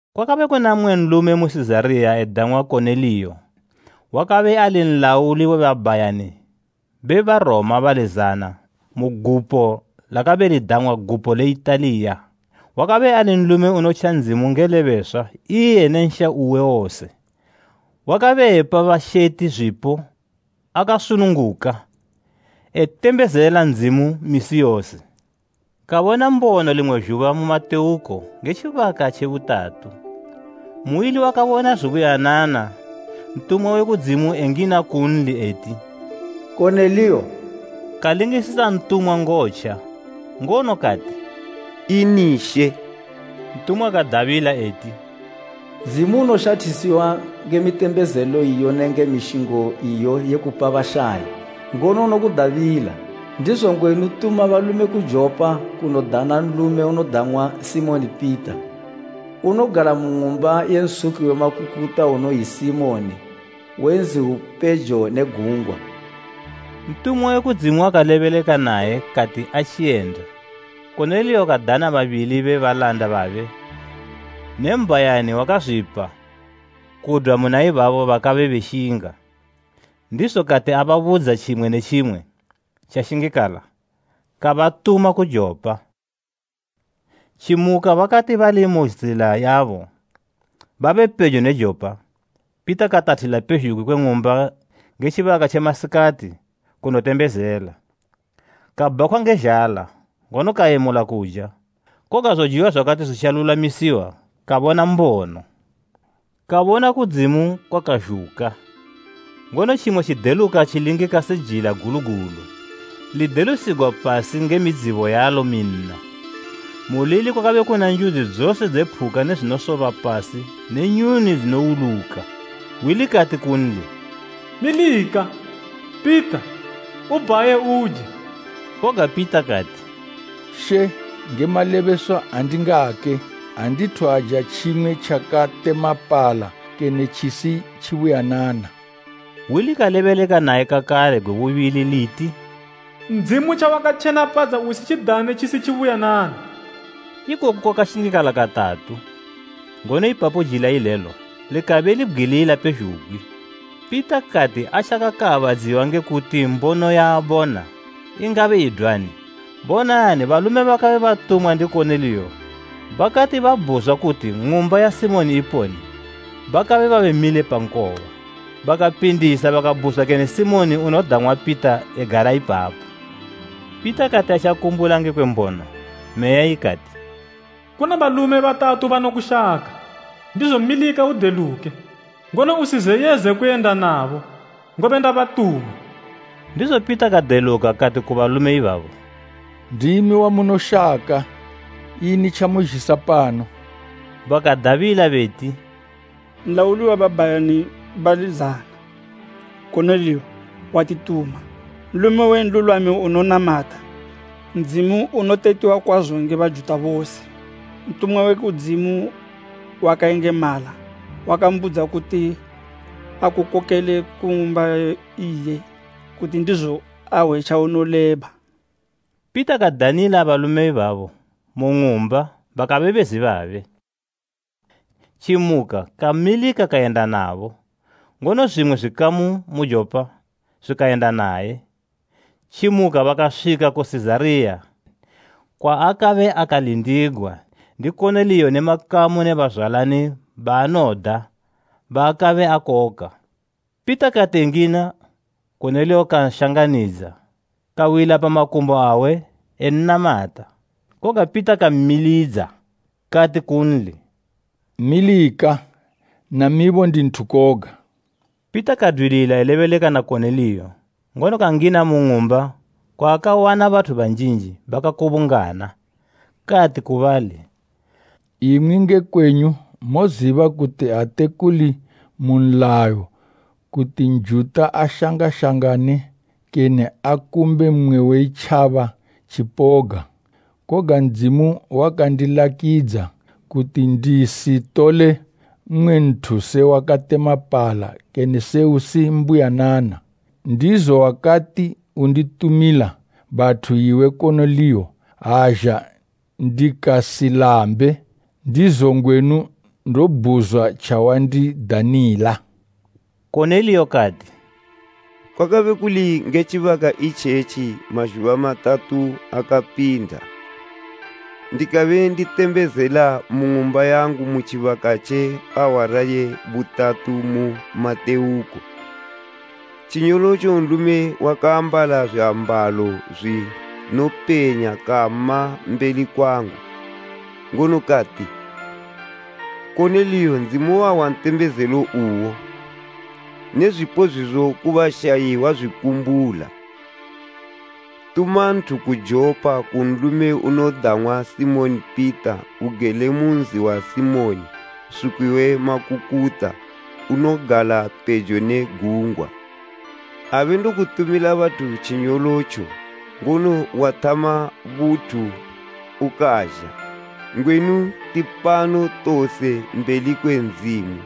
Kwakabe kuna mmwe nlume mu Sizariya edang'wa Koneliyo, wakabe ali nlauli we babhayani be Baroma bali zana mu gupo lakabe lidang'wa “Gupo le Italiya.” Wakabe ali nlume unotja Ndzimu nge lebeswa iye ne nsha uwe wose, wakabe epa basheti zwipo akasununguka etembezela Ndzimu misi yose. Kabona mbono limwe zhuba mu matewuko nge tjibaka tje butatu, muili wakabona zubuyanana ntumwa we kudzimu engina kunli eti, “Koneliyo!” Kalingisisa ntumwa ngotja, ngono kati, “Ini she?” Ntumwa kadabila eti, “Ndzimu unoshathisiwa nge mitembezelo iyo nenge mishingo iyo ye kupa bashayi ngono unokudabila. Ndizo ngwenu tuma balume ku Jopa kunodana nlume unodang'wa Simoni Pita. Unogala mu ng'umba ye nsuki we makukuta unoyi Simoni we nzi upejo ne gungwa.” Ntumwa we kudzimu wakalebeleka naye kati atjiyenda, Koneliyo kadana babili be balanda babe ne mbhayani wakazwipa kudwa muna ibabo bakabe benshinga. Ndizo kati ababudza tjimwe ne tjimwe tjashingikala, kabatuma ku Jopa. Tjimuka bakati bali mu zila yabo babepejo ne Jopa, Pita katathila pezhugwi kwe ng'umba nge tjibaka tje masikati kunotembezela. Kabhakhwa nge zhala, ngono kayemula kuja, koga zojiwa zwakati zwitjalulwamisiwa, kabona mbono. Kabona kudzimu kwakazhuka, ngono tjimwe tjideluka tjilingika se jila gulu gulu lidelusigwa pasi nge midzibo yalo minna. Mulili kwakabe kuna njudzi dzose dze phuka ne zwinosoba pasi ne nyuni dzinowuluka. Hwi likati kunli, “Milika, Pita, ubhaye uje!” Koga Pita kati, “She, nge malebeswa andingake! Andithu aja tjimwe tjakatemapala kene tjisi tjibuyanana.” Hwi likalebeleka naye kakale gwe bubili liti, “Ndzimu tjawakatjenapadza usitjidane tjisi tjibuyanana.” Ikoku kwakashingikala katatu, ngono ipapo jila ilelo likabe libgwilila pezhugwi. Pita kati atjakaabadziwa nge kuti mbono yaabona ingabe idwani, bonani balume bakabe batumwa ndi Koneliyo bakati babhuzwa kuti ng'umba ya Simoni iponi bakabe babe mile pa nkoba. Bakapindisa bakabhuzwa kene, “Simoni unodang'wa Pita egala ipapo?” Pita kati atjakumbula ngekwe mbono, Meya ikati, “Kuna balume batatu banokushaka. Ndizo milika udeluke, ngono usizeyeze kuyenda nabo, ngobe ndabatuma.” Ndizo Pita kadeluka kati ku balume ibabo, “Ndimi wamunoshaka ini tjamuzhisa pano.” Bakadabila beti, “Nlauli we babhayani bali zana, Koneliyo, watituma. Nlume we nlulwami unonamata Ndzimu unotetiwa kwazo nge Bajuta bose. Ntumwa we kudzimu wakayengemala wakambudza kuti akukokele ku ng'umba iye, kuti ndizo ahwe tjaunoleba.” Pita kadanila balume ibabo mu ng'umba bakabe bezi babe. Tjimuka kamilika kayenda nabo; ngono zwimwe zwikamu mu Jopa zwikayenda naye. Tjimuka bakaswika mu Sizariya, kwaakabe akalindigwa ndi Koneliyo ne makamu ne bazwalani baanoda baakabe akoka. Pita kati engina Koneliyo kanshangamidza, kawila pa makumbo awe ennamata. Koga Pita kammilidza. Kati kunli, “Milika, namibo ndi nthu koga.” Pita kadwilila elebeleka na Koneliyo, ngono kangina mu ng'umba kwaakawana bathu banjinji bakakubungana. Kati ku bali, “Imwi nge kwenyu moziba kuti ate kuli mu nlayo kuti Njuta ashangashangane, kene akumbe mmwe we itjaba tjipoga. Koga Ndzimu wakandilakidza kuti ndisitole mmwe nthu se wakatemapala kene se usi mbuyanana. Ndizo wakati unditumila bathu iwe Koneliyo, azha ndikasilambe. Ndizo ngwenu ndobhuzwa tjawandidanila.” Koneliyo kati, “Kwakabe kuli nge tjibaka itjetji mazhuba matatu akapinda, ndakabenditembezela mu ng'umba yangu mu tjibaka tje awara ye butatu mu matewuko. Tjinyolotjo nlume wakaambala zwiambalo zwinopenya kama mbeli kwangu. Ngono kati, ‘Koneliyo, Ndzimu wahwa ntembezelo uwo, ne zwipo zwizo ku bashayi wazwikumbula. Tuma nthu ku Jopa, ku nlume unodang'wa Simoni Pita. Ugele mu nzi wa Simoni, nsuki we makukuta, unogala pejo ne gungwa!’ Abe ndokutumila bathu tjinyolotjo, ngono wathama buthu ukazha. Ngwenu tipano tose mbeli kwe Ndzimu,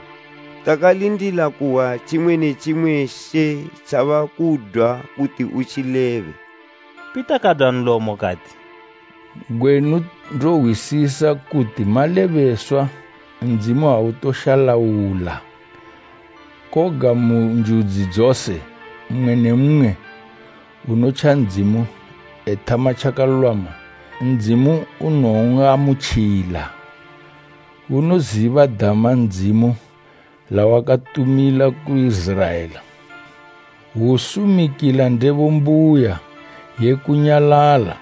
takalindila kuhwa tjimwe ne tjimwe She tjabakudwa kuti utjilebe.” Pita kadwa nlomo kati, “Ngwenu ndohwisisa kuti malebeswa Ndzimu autoshalaula. Koga mu njudzi dzose, mmwe ne mmwe unotja Ndzimu ethama tjakalulwama, Ndzimu unon'amutjila. Unoziba dama Ndzimu lawakatumila ku Iziraela, hwusumikila ndebo mbuya ye kunyalala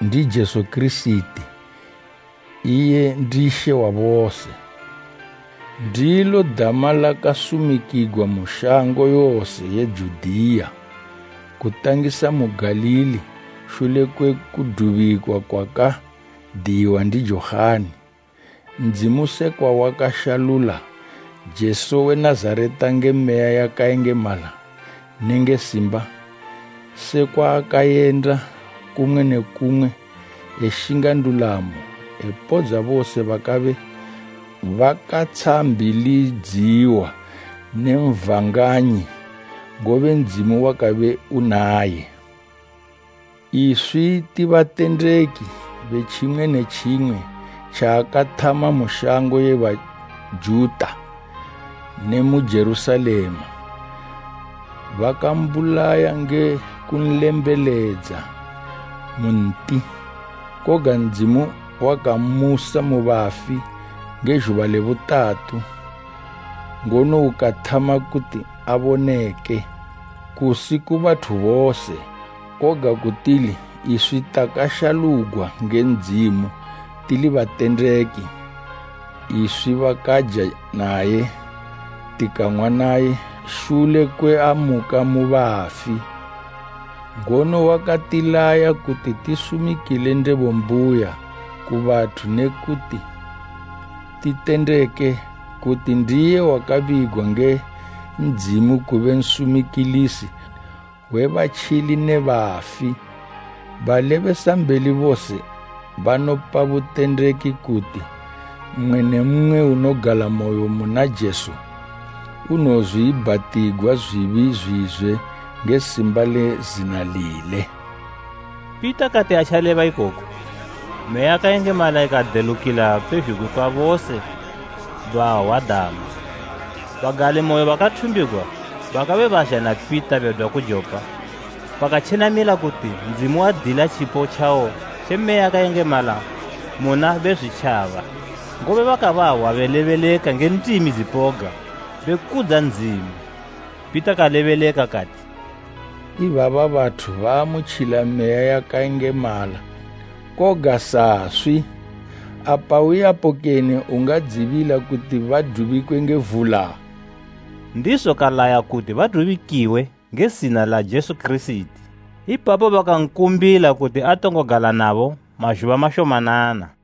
ndi Jesu Kirisiti, iye ndi She wa bose. Ndilo dama lakasumikigwa mu shango yose ye Judiya, kutangisa mu Galili shule kwe kudubikwa kwakadiyiwa ndi Johani; Ndzimu sekwa wakashalula Jesu we Nazareta nge Meya yakayengemala nenge simba; sekwa akayenda kumwe ne kumwe eshinga ndulamo, epodza bose bakabe bakatshambilidziwa ndi Satani, ngobe Ndzimu wakabe unaye. Iswi ti batendeki be tjimwe ne tjimwe tjaakathama mu shango ye Bajuta ne mu Jerusalema. Bakambulaya nge kunlembeledza mu nti. Koga Ndzimu wakammusa mu bafi nge zhuba le butatu, ngono ukathama kuti aboneke, kusi ku bathu bose, koga ku tili iswi takashalugwa nge Ndzimu tili batendeki, iswi bakaja naye tikang'wa naye shule kwe amuka mu bafi. Ngono wakatilaya kuti tisumikile ndebo mbuya ku bathu ne kuti titendeke kuti ndiye wakabigwa nge Ndzimu kube nsumikilisi we batjili ne bafi. Balebesambeli bose banopa butendeki kuti, mmwe ne mmwe unogalamoyo muna Jesu unowozwiibhatigwa zwibi zwizwe nge simba le zina lile.” Pita kati atjaleba ikoku, Meya yakayengemala ikadelukila pezhugwi kwa bose bahwa dama. Bagalimoyo bakathumbigwa bakabe bazha na Pita bedwa ku Jopa bakatjenamila kuti Ndzimu wadila tjipo tjawo tje Meya yakayengemala muna Bezwitjaba, ngobe bakabahwa belebeleka nge ndimi dzipoga be kudza Ndzimu. Pita kalebeleka kati, “Ibaba bathu baamutjila Meya yakayengemala, koga saswi. Apa uyapo kene ungadzibila kuti badubikwe nge vula?” Ndizo kalaya kuti badubikiwe nge zina la Jesu Kirisiti. Ipapo bakankumbila kuti atongo gala nabo mazhuba mashomanana.